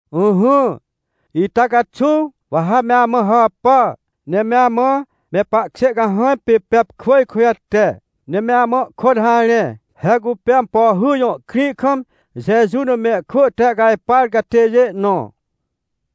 Ỹhỹ, ita caxuw, wa ha me amã hàpà, ne me amã me pahkjê cahãj pê Pepkwỳj kujate, ne me amã ihkôt harẽ. He cupê Ampohy jõ krĩ kam Jeju na mehkwỳ tehcajpar catêjê nõ.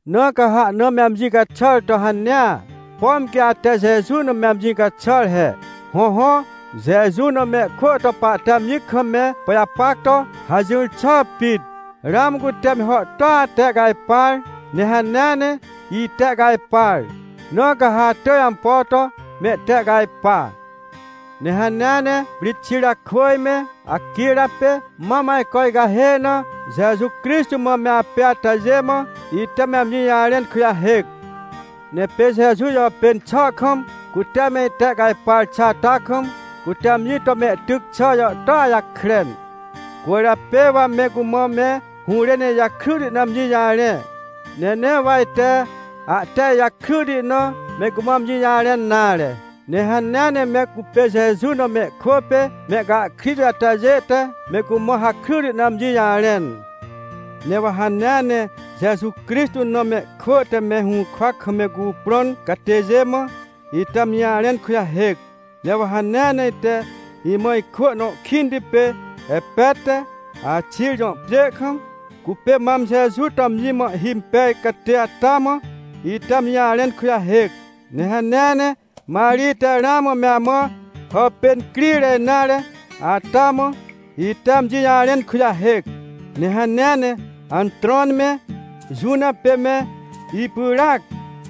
Na ca ha ahna me amji caxàr to hanea, pom quê ate Jeju na me amji caxàr he. Hõhõ, Jeju na mehkwỳ to pahte amji kam me pajapac to hajỹr xà pit. Ramã cute me hàhtôa tehcajpar, ne hanea ne itehcajpar, na ca ha atỳj ampo to mehtehcajpa. Ne hanea ne Prixirakwỳj me Aquira pê mam ajco icahê na Jeju Crixtô mã me apê atajê mã ite me amji jarẽn kujahêc. Ne pê Jeju jàpên xà kam, cute me itehcajpar xà ata kam, cute amji to mehtyc xà jàhtôa jakren. Cwỳrjapê wa me cumã me hũrên ijakryti na amji jarẽ, ne nee wa ite ahte ijakryti na me cumã amji jarẽn nare. Ne hanea ne me cupê Jeju na mehkwỳ pê mehcahkrit atajê te me cumã hakryti na amji jarẽn. Ne wa hanea ne Jeju Crixtô na mehkwỳ te me hũrkwa kam me cuprõn catêjê mã, ite amji jarẽn kujahêc. Ne wa hanea ne ite imã ikwỳ nõ kĩnti pê Epet te Axij jõ pjê kam, cupê mam Jeju to amji mã ihhimpej catê ata mã, ite amji jarẽn kujahêc. Ne hanea ne Marij te ramã me amã hàpên crire nare ata mã, ite amji jarẽn kujahêc. Ne hanea ne Antrôn me Juna pê me ipyràac,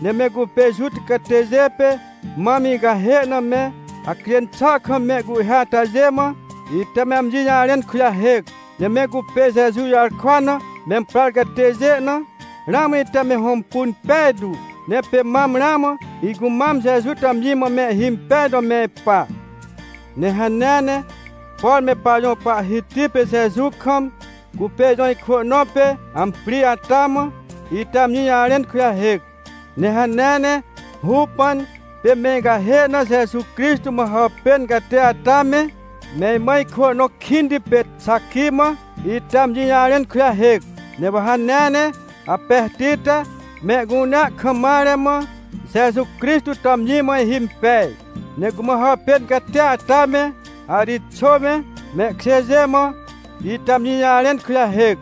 ne me cupê Juta catêjê pê mam icahê na me hacjên xà kam mehcuhhê atajê mã, ite me amji jarẽn kujahêc. Ne me cupê Jeju jarkwa na memprar catêjê na, ramã ite me hõmpun pejtu, ne pê mam ramã icumam Jeju to amji mã mehhimpej to me ipa. Ne hanea ne, por me pajõ Pahhiti pê Jeju kam, cupê ijõ ikwỳ nõ pê Amprij ata mã, ite amji jarẽn kujahêc. Ne hanea ne Rupan pê me icahê na Jeju Crixtô mã hàpên catê ata me, me imã ikwỳ nõ kĩnti pê Xaqui mã, ite amji jarẽn kujahêc. Ne wa hanea ne Aperti te mehcunea kam mare mã Jeju Crixtô to amji mã ihhimpej, ne cumã hàpên catia ata me, Arixô me, mehkjêjê mã, ite amji jarẽn kujahêc.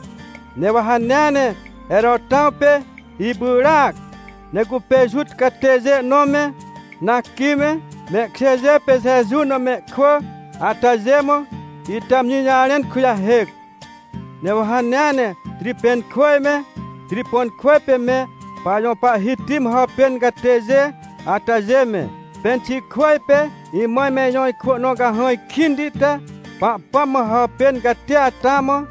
Ne wa hanea ne Herotãw pê ipyràac, ne cupê Juta catêjê nõ me, Narqui me, mehkjêjê pê Jeju na mehkwỳ atajê mã, ite amji jarẽn kujahêc. Ne wa hanea ne Tripenkwỳj me, Triponkwỳj pê me pajõ Pahhiti mã hàpên catêjê atajê me, Penxikwỳj pê imã me ijõ ikwỳ nõ cahãj kĩnti te Pahpãm mã hàpên catia ata mã,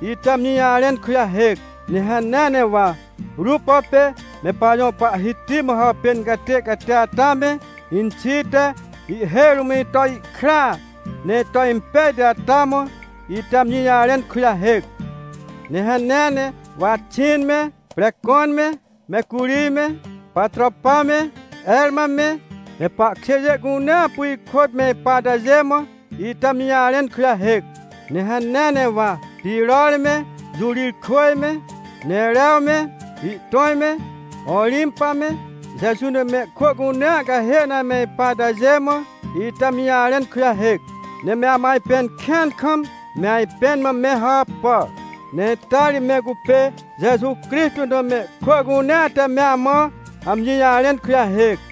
ite amji jarẽn kujahêc. Ne hanea ne wa Rupo pê me pajõ Pahhiti mã hàpên catê catia ata me, inxi te ihhêj rũm ito ihkraa, ne ito impejti ata mã, ite amji jarẽn kujahêc. Ne hanea ne, wa Axin me, Precon me, Mecurij me, Patropa me, Herma me, me pahkjêjê cunea apu ihkôt me ipa atajê mã, ite amji jarẽn kujahêc. Ne hanea ne wa Piror me, Jurijkwỳj me, Nerew me, ihtõj me, Orimpa me, Jeju na mehkwỳ cunea cahê na ame ipa atajê mã, ite amji jarẽn kujahêc. Ne me amã ajpẽn kĩan kam me ajpẽn mã me hàpà. Ne ita ri me cupê Jeju Crixtô na mehkwỳ cunea te me amã amji jarẽn kujahêc.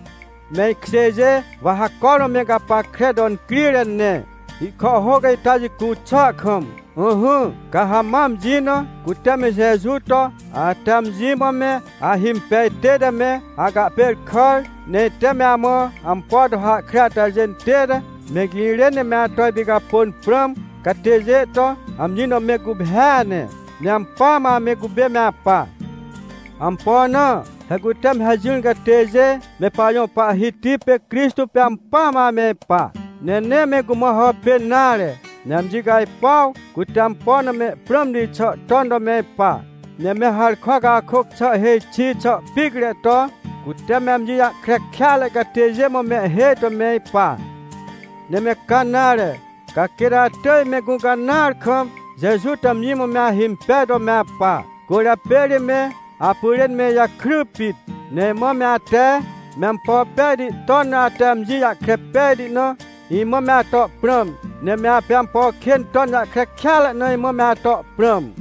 Me ikjêjê wa ha cormã me gapackre to incrire ne, ihkàhhôc ita jicu xà kam. Ỹhỹ, ca ha ma amji na, cute me Jeju to, ate amji mã me ahimpej tête me acahpêrkàr, ne ite me amã ampo to hahkre atajê tête me girên ne me ato ipicapôn prãm catêjê to, amji na me guphêa ne. Ne ampỳa mã ame cupê me apa. Ampo na? He cute me hajỹr catêjê, me pajõ Pahhiti pê Crixtô pê ampỳa mã ame ipa, ne nee me cumã hàpên nare, ne amji cajpuaw cute ampo na mehprãmti xà ton to me ipa. Ne me harkwa cakôc xà hêj xi xà picre to, cute me amji jahkre kêatre catêjê mã mehhêj to me ipa. Ne me ca nare, ca quêt atỳj me gũcanãar kam Jeju to amji mã me ahimpej to me apa. Cwỳrjapê ri me apyrên me ijakry pit. Ne imã me ate, me ampo pejti ton na ate amji jahkre pejti na, imã me ato prãm, ne me apê ampo kên ton jahkre kêatre na imã me ato prãm.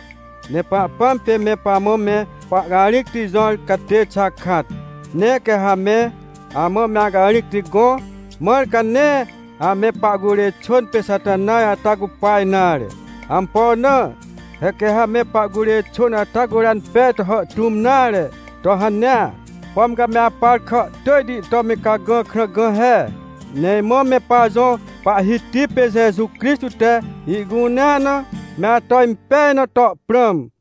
Ne Pahpãm pê me pamã me pahcarĩcti jõr catê xakat, ne quê ha me amã me acarĩcti gõ, mãr ca nee ame pahcurê xwỳn pê Xatanaj ata cupa nare. Ampo na? He quê ha me pahcurê xwỳn ata curan pej to hàhtũm nare to hanea, pom ca me apar kàhtỳjti to me cagã krã gã he. Ne imã me pajõ Pahhiti pê Jeju Crixtô te ihcunea na me ato impej na to prãm.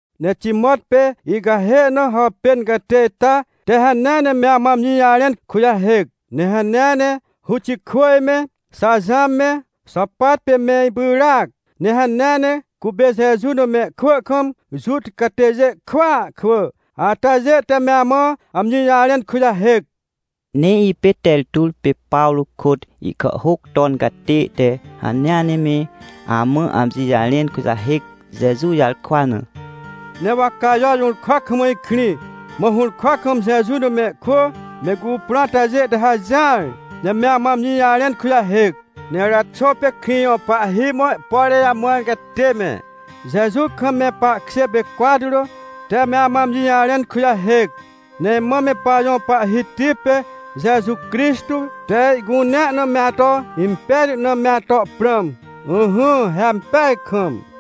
Ne Timot pê icahê na hàpên catê ita te hanea ne me amã amji jarẽn kujahêc. Ne hanea ne Ruxô me, Jaxãw me, Xôpat pê me ipyràac, ne hanea ne cupê Jeju na mehkwỳ kam Juta catêjê kwỳa kwỳ atajê te me amã amji jarẽn kujahêc. Ne ipê Tertur pê Pawrô kôt ihkàhhôc ton catê te hanea ne me amã amji jarẽn kujahêc, Jeju jarkwa na. Ne wa Cajo jũrkwa kam ikrĩ, mã hũrkwa kam Jeju na mehkwỳ me cuprõ atajê te hajỹar, ne me amã amji jarẽn kujahêc. Ne Eraxô pê krĩ jõ pahhi mã ihpore jamãr catê me, Jeju kam me pahkjê pê Cwatro te me amã amji jarẽn kujahêc. Ne imã me pajõ Pahhiti pê Jeju Crixtô te ihcunea na me ato impejti na me ato prãm. Ỹhỹ, he ampeaj kam.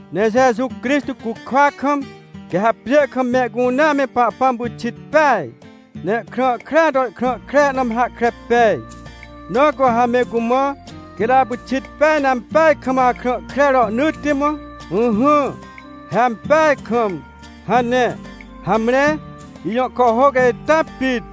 Ne Jeju Crixtô cukwa kam, quê ha pjê kam mehcunea me Pahpãm pyxit peaj, ne ihkrã krea to ihkrã kre na me hahkre pej, na cu ha me cumã: — Quêt apyxit peaj ne ampeaj kam akrã kre rohnỳtti mã. Ỹhỹ, he ampeaj kam — hane. Hamre, ijõ kàhhôc ita pit.